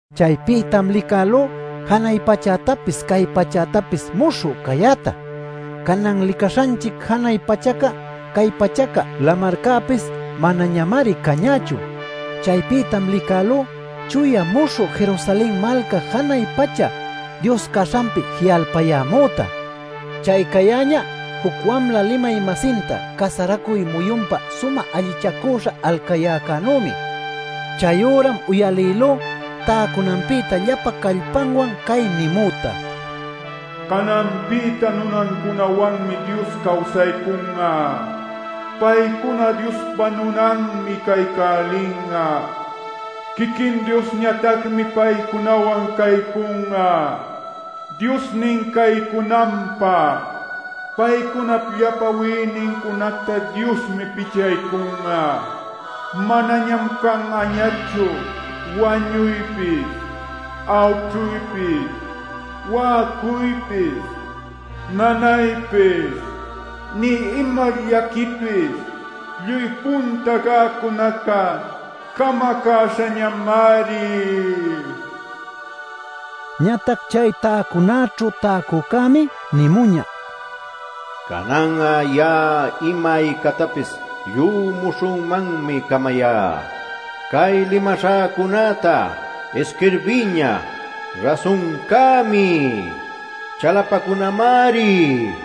Chaypïtam licälú janay pachätapis cay pachätapis muśhü cayäta. Canan licaśhanchic janay pachaca, cay pachaca, lamarcäpis manañamari cañächu. Chaypïtam licälú chuya muśhü Jerusalen malca janay pacha Dios caśhanpi ji'alpayämüta. Chay cayäñä juc wamla limay-masinta casaracuy muyunpä sumä allichacüśha alcayäcänümi. Chayüram uyalïlú täcunanpïta llapa callpanwan cay nimüta: “Cananpïta nunancunawanmi Dios cawsaycun'a. Paycuná Diospa nunanmi caycälin'a; quiquin Diosñatacmi paycunawan caycun'a Diosnin caycunanpä. Paycunap llapa wïnincunacta Diosmi pichaycun'a; manañam can'añachu wañuypis, awćhuypis, wa'acuypis, nanaypis, nï ima llaquipis lluy punta cäcunaca camacäśhañamari” niñä. Ñatac chay täcunaćhu täcücämi nimuñä: “Canan'a ya'a ima aycactapis lluy muśhümanñam camayá. Cay limaśhäcunäta isquirbiyña; rasuncämi, chalapacunamari” nil.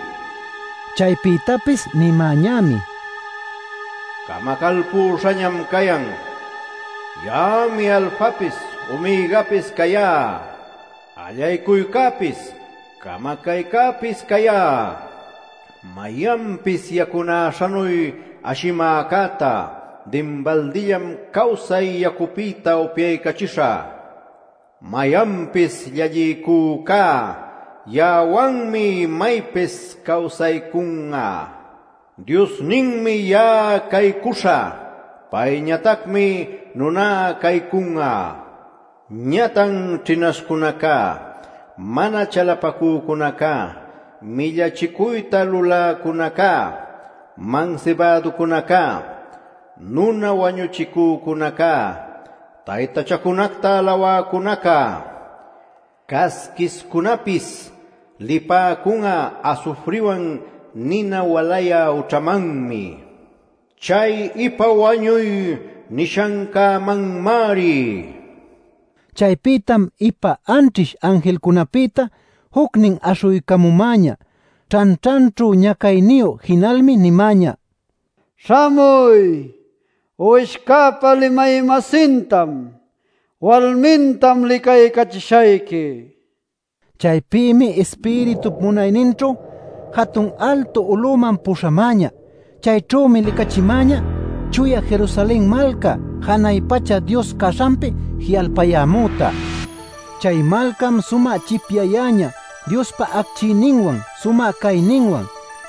Chaypïtapis nimäñämi: “Camacalpüśhañam cayan. Ya'ami Alfapis Omegapis cayá; allaycuycäpis camacaycäpis cayá. Mayanpis yacunäśhanuy ashimäcätá dinbaldillam cawsay yacupïta upyaycachishä. Mayanpis llalliycücá ya'awanmi imaypis cawsaycun'a; Diosninmi ya'a caycuśhä; payñatacmi nuná caycun'a. Ñatac ćhinaśhcunaca, mana chalapacücunaca, millachicuyta luläcunaca, mansibäducunaca, nuna wañuchicücunaca, taytachacunacta alawäcunaca, casquishcunäpis lipäcun'a asufriwan nina walayä ućhamanmi, chay ‘ipa wañuy’ nishancämanmari” nin. Chaypïtam ipa anćhish anjilcunapïta jucnin aśhuycamumäñä ćhanćhanćhu ñacayniyu. Jinalmi nimäñä: “Śhamuy, Uwishcäpa limay-masintam, walmintam licaycachishayqui” nil. Chaypïmi Ispiritup munayninćhu jatun altu uluman puśhämäñä. Chayćhümi licachimäñä chuya Jerusalen malca janay pacha Dios caśhanpi ji'alpayämüta. Chay malcam sumä chipyayäñä Diospa acchiyninwan, sumä cayninwan.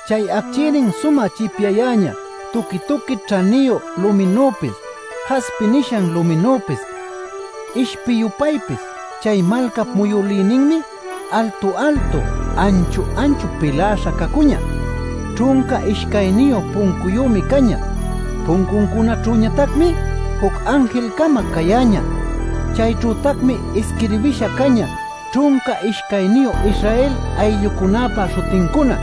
Chay acchiynin sumä chipyayäñä tuqui-tuqui ćhaniyu luminüpis, jaspi nishan luminüpis, ishpi-yupaypis. Chay malcap muyülïninmi altu-altu, anchu-anchu piläśha cacuñä. Ćhunca ishcayniyu puncuyümi cañä. Puncuncunaćhütacmi juc anjil-cama cayäñä. Chayćhütacmi isquirbïsha cañä ćhunca ishcayniyu Israel ayllucunäpa śhutincuna.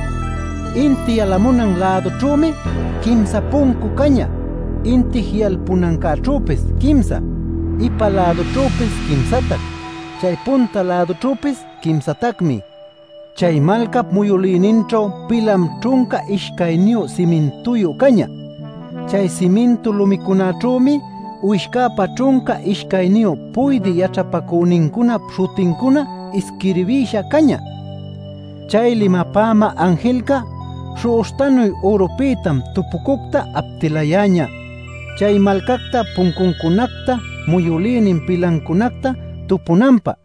Inti yalamunan lädućhümi quimsa puncu cañä; inti ji'alpunancäćhüpis quimsa; ipa-lädućhüpis quimsatac; chay punta-lädućhüpis quimsatacmi. Chay malcap muyülïninćhu pilam ćhunca ishcayniyu simintuyu cañä. Chay simintu lumicunaćhümi Uwishcäpa ćhunca ishcayniyu puydï yaćhapacünincunap śhutincuna isquirbïsha cañä. Chay limapämä anjilca śhu'uśhtanuy ürupïta tupucuctam aptilayäñä chay malcacta, puncuncunacta, muyülïnin pilancunacta tupunanpä.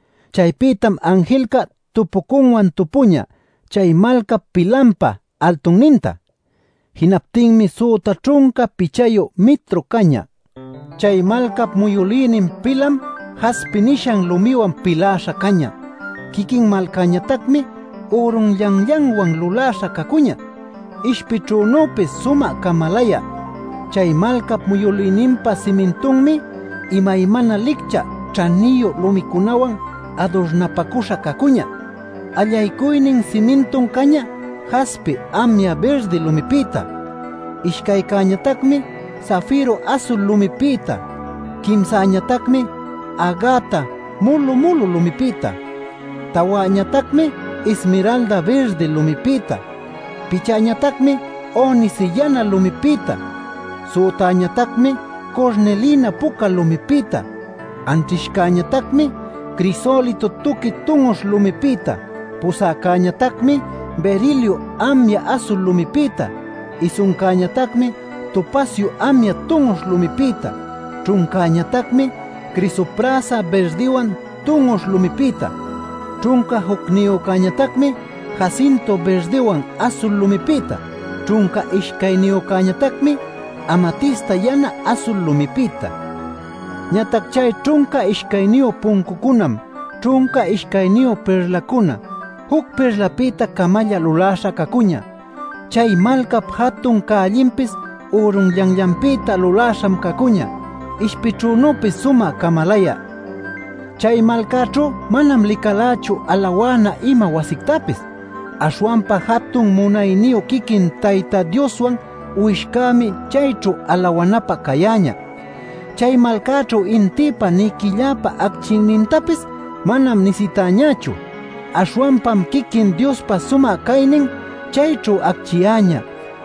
Chaypïtam anjilca tupucunwan tupüñä chay malcap pilanpa altunninta. Jinaptinmi süta ćhunca pichayu mitru cañä. Chay malcap muyülïnin pilam jaspi nishan lumiwan piläśha cañä. Quiquin malcañatacmi ürunllanllanwan luläśha cacuñä, ishpićhünüpis sumä camalayä. Chay malcap muyülïninpa simintunmi imaymana licchä ćhaniyu lumicunawan adurnapacüśha cacuñä: allaycuynin simintum cañä jaspi amya birdi lumipïta, ishcaycäñatacmi safiru asul lumipïta, quimsäñatacmi agata mulu-mulu lumipïta, tawäñatacmi ismiralda birdi lumipïta. Pichäñatacmi onice yana lumipïta, sütäñatacmi curnilina puca lumipïta, anćhishcäñatacmi crisolito tuqui tun'uśh lumipïta, pusäcäñatacmi berilio amya asul lumipïta, isuncäñatacmi topacio amya tun'uśh lumipïta, ćhuncäñatacmi crisoprasa birdiwan tun'uśh lumipïta, ćhunca jucniyücäñatacmi jacinto birdiwan asul lumipïta, ćhunca ishcayniyücäñatacmi amatista yana asul lumipïta. Ñatac chay ćhunca ishcayniyu puncucunam ćhunca ishcayniyu pirlacuna; juc pirlapïta-camalla luläśha cacuñä. Chay malcap jatun cällinpis ürunllanllanpïta luläśham cacuñä, ishpićhünüpis sumä camalayä. Chay malcaćhu manam licalächu alawana ima wasictapis. Aśhwanpa jatun munayniyu quiquin Tayta Dioswan Uwishcämi chayćhu alawanapä cayäñä. Chay malcaćhu intïpa nï quilläpa acchiynintapis manam nisitäñächu. Aśhwanpam quiquin Diospa sumä caynin chayćhu acchiyäñä;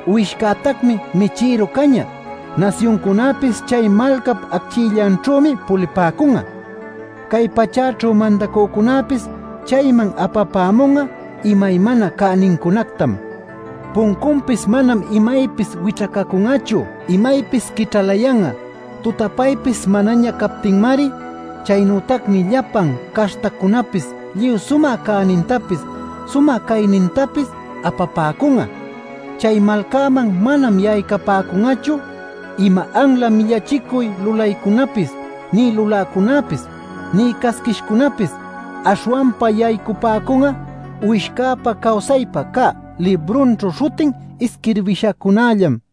Uwishcätacmi michïru cañä. Nasyuncunäpis chay malcap acchiyllanćhümi pulipäcun'a. Cay pachäćhu mandacücunäpis chayman apapämun'a imaymana cänincunactam. Puncunpis manam imaypis wićhacacun'achu; imaypis quićhalayan'a tutapaypis manaña captinmari. Chaynütacmi llapan caśhtacunäpis lluy sumä cänintapis, sumä caynintapis apapäcun'a. Chay malcaman manam yaycapäcun'achu ima anla millachicuy lulaycunapis nï luläcunäpis, nï casquishcunäpis. Aśhwanpa yaycapäcun'a Uwishcäpa cawsaypä cä librunćhu śhutin isquirbishacunällam.